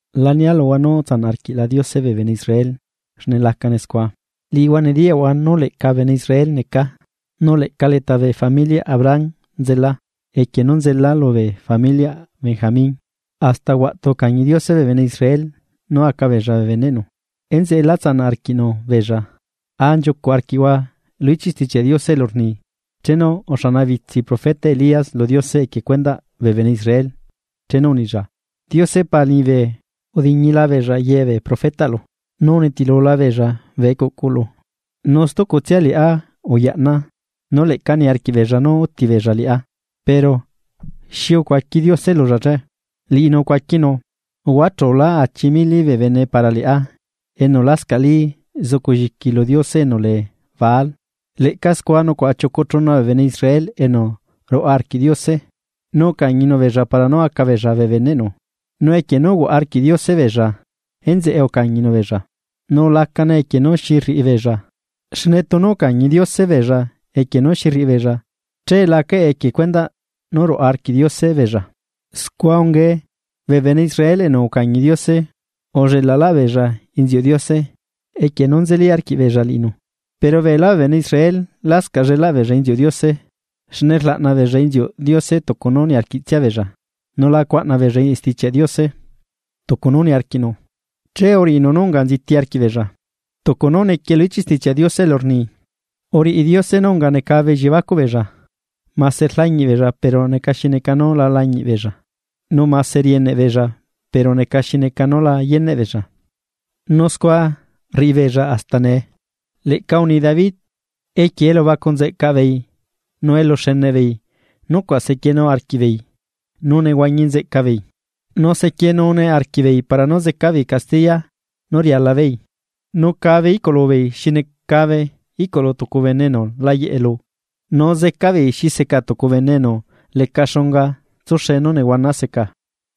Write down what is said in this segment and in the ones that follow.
La nia luhua nú utsanaꞌ arquiꞌla Diose bee bene Israel, xne lacane scua. Liꞌihua nediyaꞌhua nú leꞌca bene Israel necaa, nu leꞌca leta bee familiaꞌ Abraham nzelaa equie nú nzelaa lubee familiaꞌ Benjamin. Asta huaꞌtu ucañi Diose bee bene Israel nú aca beella bee beneꞌnu, enzeꞌe la tsanaꞌ arquiꞌnu beella. A nchiucuꞌ arquiꞌhua lu ichiꞌ Stichiaꞌ Diose elu rni: Chenu uxanabitsi profeta Elías lu Diose equie cuendaꞌ bee bene Israel chenu unilla: “Diose Pa liñibe, udiñila beella ye bee profetaꞌlu, nu unitilula beella bee ecuꞌcuꞌlu. Nu stucutsia liꞌá uyaꞌnaa nu leꞌca niarquiꞌ beella nú úti beella liꞌá.” Pero ¿xi ucuaqui Diose lulla che? Liꞌinu ucuaquinu: “Uhuachulá achi mili bee bene para liꞌá enu lascaꞌli zuculliqui lu diose enu lee Baal.” Leꞌca scua nucuaꞌa chiucu chuna bee bene Israel enu ruaꞌa arquiꞌ Diose, nu ucañinu beella para nú aca beella bee beneꞌnu. Nu equie nú uhuaꞌa arquiꞌ Diose beella, enzeꞌe ucañinu beella, nu la necane equie nú xi rriꞌibeella, xne tunu ucañi Diose beella equie nú xi rriꞌibeella che la acaꞌe equie cuendaꞌ nú ruꞌa arquiꞌ Diose beella. Scua ungae. Bee bene Israel enu ucañi Diose, ullelaꞌlaꞌbeella inziuꞌ Diose equie nú nzeli arquiꞌbeella liꞌinu. Pero beelá bee bene Israel lascaꞌ llelaꞌ beella inziuꞌ Diose, xne rlaꞌna beella inziuꞌ Diose tucu nú niarquiꞌtsiabeella, nu la cuaꞌna beella Stichiaꞌ Diose tucu nú niarquiꞌnu, che uriꞌinu nú unga nziti arquiꞌbeella. Tucu nú nequie lu ichiꞌ Stichiaꞌ Diose elu rni: “Uriꞌi Diose nú unga necabe elliebacuꞌ beella, mase rlañiꞌ beella pero neca xi neca nú la lañiꞌbeella, nu mase rieneꞌ beella pero neca xi neca nú la yeneꞌ beella”, nu scua rriꞌibeella hasta nee. Leꞌca uni David: Equie elubacu nzeꞌcaꞌ beei nu eluxeneꞌbeei nucuaꞌ sequienu arquiꞌbeei nú nehuañi nzeꞌca beei, nu zequienune arquiꞌbeei para nú zeca beei castiya nú rialabeei, Nu cabe iꞌcuꞌlubeei xi necabe iꞌcuꞌlu tucu bene enu la yeꞌe lu, nu zecabeei xi seca tucu bene enu leca xunga tsuxe nú nehuana seca.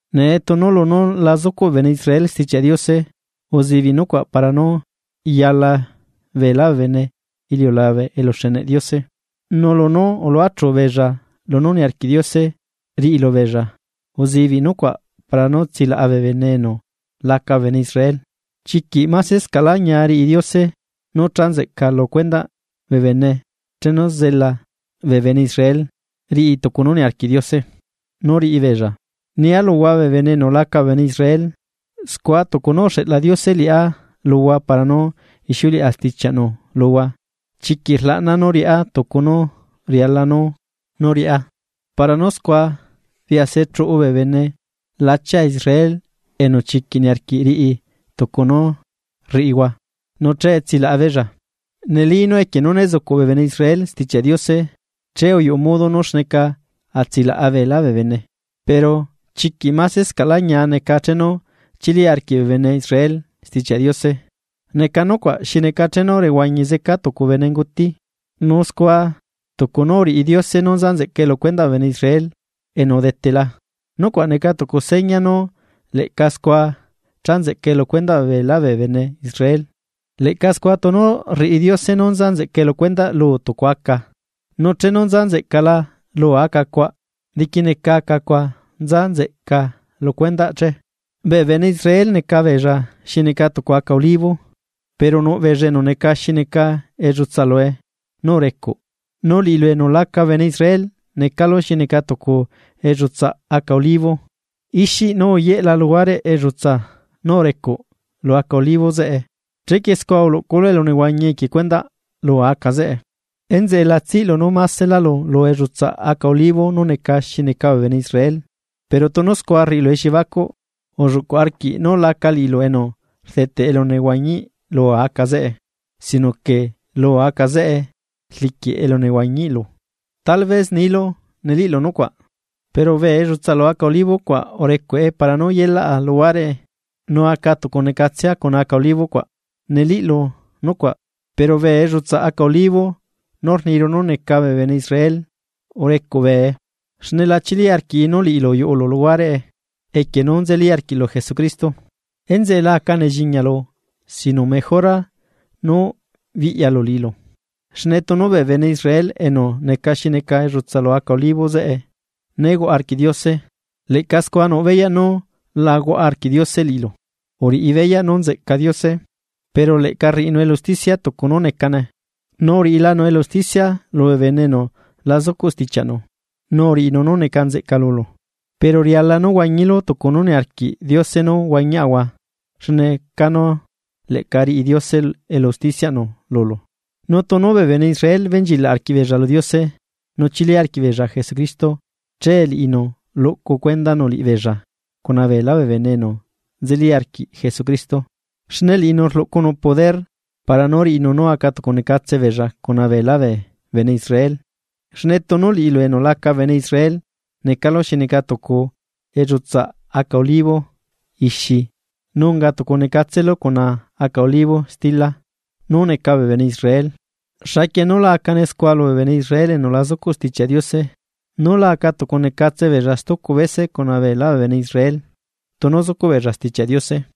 Nee tunu lunú la zucuꞌ bee bene Israel Stichiaꞌ Diose, uzibiꞌ nucuaꞌ para nú yala beelá bee bene iliulabe eluxeneꞌ Diose, nu lunú uluachu beella lunú niarquiꞌ Diose riꞌilubeella uzibiꞌ nucuaꞌ para nú tsilaꞌa bee bene enu laca bee bene Israel. ¡Chiquiꞌ masescaꞌlá ñia riꞌi Diose nú cha nzeꞌca lu cuendaꞌ bee bene chenu zela bee bene Israel riꞌi tucu nú niarquiꞌ Diose nú riꞌibeella! Nia luhua bee bene enu laca bee bene Israel, scua tucu nú uxeꞌla Diose liꞌá luhua para nú ixiuleꞌa stichiaꞌnu luhua, chiquiꞌ rlaꞌnaa nú riꞌá tucu nú riala nú riꞌá, para nú scua biase chuꞌu bee bene lachia Israel enu chiquiꞌ niarquiꞌ riꞌi tucu nú rriꞌihua, nu che tsilaꞌabeella. Neli nú equie nu né zucuꞌ bee bene Israel Stichiaꞌ Diose, scua uyuꞌu modo nú xneca atsilaꞌa beelá bee bene. Pero, ¿chiquiꞌ masescaꞌlá ñia neca chenu chili arquiꞌ bee bene Israel Stichiaꞌ Diose? neca nucuaꞌ xi neca chenu rehuañi zeca tucu bene enu unguti. Nu scua tucu nú uriꞌi Diose nú nza nzeꞌcae lu cuendaꞌ bee bene Israel enu udetela, nucuaꞌ neca tucu seña nú leꞌca scua cha nzeꞌcae lu cuendaꞌ beelá bee bene Israel, leꞌca scua tunu rriꞌi Diose nú nza nzeꞌca lu cuendaꞌ luu tucu aca, nu chenu nza nzeꞌcala luu aca cuaꞌ, diquineca aca cuaꞌ nza nzeꞌca lu cuendaꞌ che. Bee bene Israel neca beella xi neca tucu aca olivo, pero nuꞌ beella enu neca xi neca ellutsa lue nú urecuꞌ, nu liꞌilu enu laca bene Israel necalu xi neca tucu ellutsaꞌ aca olivo ixi nú uyelaꞌ luhuareꞌ ellutsaa nú urecuꞌ lu aca olivo zeꞌe, chequie scua rluꞌculu elunehuañi equie cuendaꞌ luu aca zeꞌe. Enzeꞌe la tsiꞌlu nú maselálu lu ellutsaꞌ aca olivo nú neca xi neca bee bene Israel. Pero tunu scua rriꞌilu elliebacuꞌ, ulluꞌcuꞌ arquiꞌ nú laca liꞌilu enu rdeteꞌ elunehuañiꞌ luu aca zeꞌe sino que luu aca zeꞌe rliquiꞌ elunehuañiꞌlu. Tal vez nilu: “Neliꞌlu nucuaꞌ, pero bee ellutsaa lu aca olivo cuaꞌ urecuꞌe para nú yelaꞌa luhuareꞌe nu acatucunecatsea cuna aca olivo cuaꞌ.” Neliꞌlu nucuaꞌ, pero bee ellutsaꞌ aca olivo nú rniru nú neca bee bene Israel urecuꞌ bee xne la chili arquii nu liꞌilu uyuꞌulu luhuareꞌe equie nú nzeli arquiꞌlu Jesucristo, enzeꞌe la aca nelliñalu sino mejora nú biꞌya liꞌilu. Xne tunu bee bene Israel enu neca xineca ellutsa lu aca olivo zeꞌe né huaꞌa arquiꞌ Diose leꞌca scua nuꞌ beyaꞌ nú la huaꞌa arquiꞌ Diose liꞌilu. Uriꞌi beyaꞌ nú nzeꞌca Diose, pero leꞌca rriꞌinu elu usticia tucu nú necane. Nu uriꞌilanu elu usticia lubee bene enu la zucuꞌ stichiaꞌnu, nu uriꞌinu nú neca nzeꞌca lulu. Pero riala nú huañilu tucu nú niarquiꞌ Diose nú huañiaꞌahua xne canu leꞌca riꞌi Diose elu usticiaꞌnu lulu. Nu tunu bee bene Israel benchilaꞌ arquiꞌbeella lu Diose nu chili arquiꞌbeella Jesucristo che liꞌinu luꞌcu cuendanu liꞌibeella cuna beelá bee bene enu nzeli arquiꞌ Jesucristo. Xne liꞌinu rluꞌcunu poder para nú riꞌinu nú acatucunecatse beella cuna beelá bee bene Israel. Xne tunu liꞌilu enu laca bene Israel necalu xi neca tucu ellutsaa aca olivo ixi nu unga tucunecatselu cuna aca olivo stila nú neca bee bene Israel, ¡xaquie nú la acane scua lubee bene Israel enu lá zucuꞌ Stichiaꞌ Diose nú la aca tucunecatse beella stucu bese cuna beelá bee bene Israel, tunu zucuꞌ beella Stichiaꞌ Diose!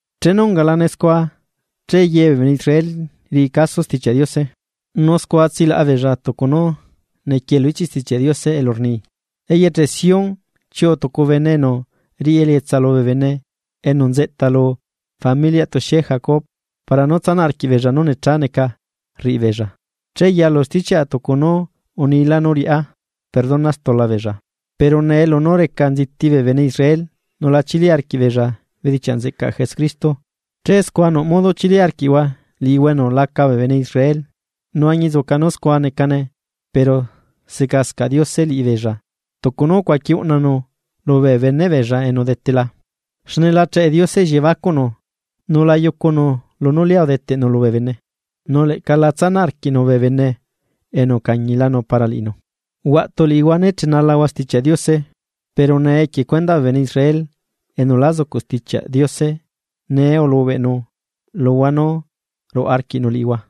Chenu ungalane scua che ye bee bene Israel riꞌi caso Stichiaꞌ Diose. Nu scua tsilaꞌa beella tucu nú nequie lu ichiꞌ Stichiaꞌ Diose elu rni: Eyeche Sión chiuꞌu tucu bene enu riꞌi elietsa lubee bene enu nzeꞌta lu familiaꞌ tuxie Jacob, para nú tsanaꞌ arquiꞌbeella nú necha neca rriꞌibeella. Che yalu stichiaꞌa tucu nú unila nú riaꞌá perdona stula beella. Pero nee lunú reca nziti bee bene Israel nu lá chili arquiꞌbeella bedichiaꞌ nzeꞌcaꞌ Jesucristo, che scua nuꞌ modo chili arquiꞌhua liꞌihua enu laca bee bene Israel. Nu añinzuca nú scua necane pero secascaꞌ Diose liꞌibeella tucu nú ucuaqui uꞌnanu lubee beneꞌbeella enu udetela. Xne la cheꞌe Diose elliebacuꞌnu, nu la yucunu lunú lia udeteꞌnu lubee bene, nu leꞌca la tsanaꞌ arquiꞌnu bee bene enu ucañilanu para liꞌinu. Huaꞌtu liꞌihua ne chenalahua Stichiaꞌ Diose. Pero nee equie cuendaꞌ bee bene Israel enu la zucuꞌ Stichiaꞌ Diose nee ulubeꞌnu luhua nú ruaꞌa arquiꞌnu liꞌihua.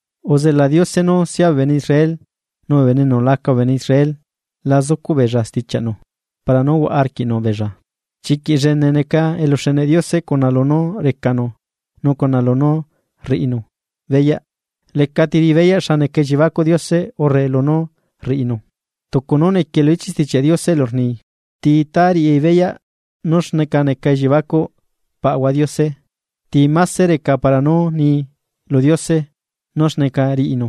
Uzela Diose nú sia bee bene Israel nu bee bene enu laca bene Israel la zucuꞌ beella stichiaꞌnu para nú huaꞌa arquiꞌnu beella. ¡Chiquiꞌ llene neca eluxeneꞌ Diose cuna lunú recanu nu cuna lunú rriꞌinu beyaꞌ! Lecati riꞌibeyaꞌ xa neca elliebacuꞌ Diose urre lunú rriꞌinu, tucu nú nequie lu ichiꞌ Stichiaꞌ Diose elu rni: “¿Ti itá riꞌi beyaꞌ nú xneca neca elliebacuꞌ Paꞌahua Diose? ¿Ti máse reca para nú nii lu Diose nú xneca riꞌinu?”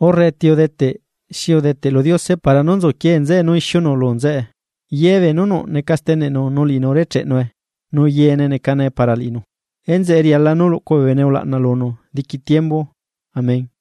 Urre, “¿ti udeteꞌ xi udeteꞌ lu Diose para nú nzuquie nzeꞌe nú ixiunu lu nzeꞌe?” Yebee nú nuꞌ neca steneꞌnu nu liꞌinu urecheꞌnue nu yeene necane para liꞌinu. Enzeꞌe riala nú luꞌcu bee bene ulaꞌna lunu diqui tiembu. Amén.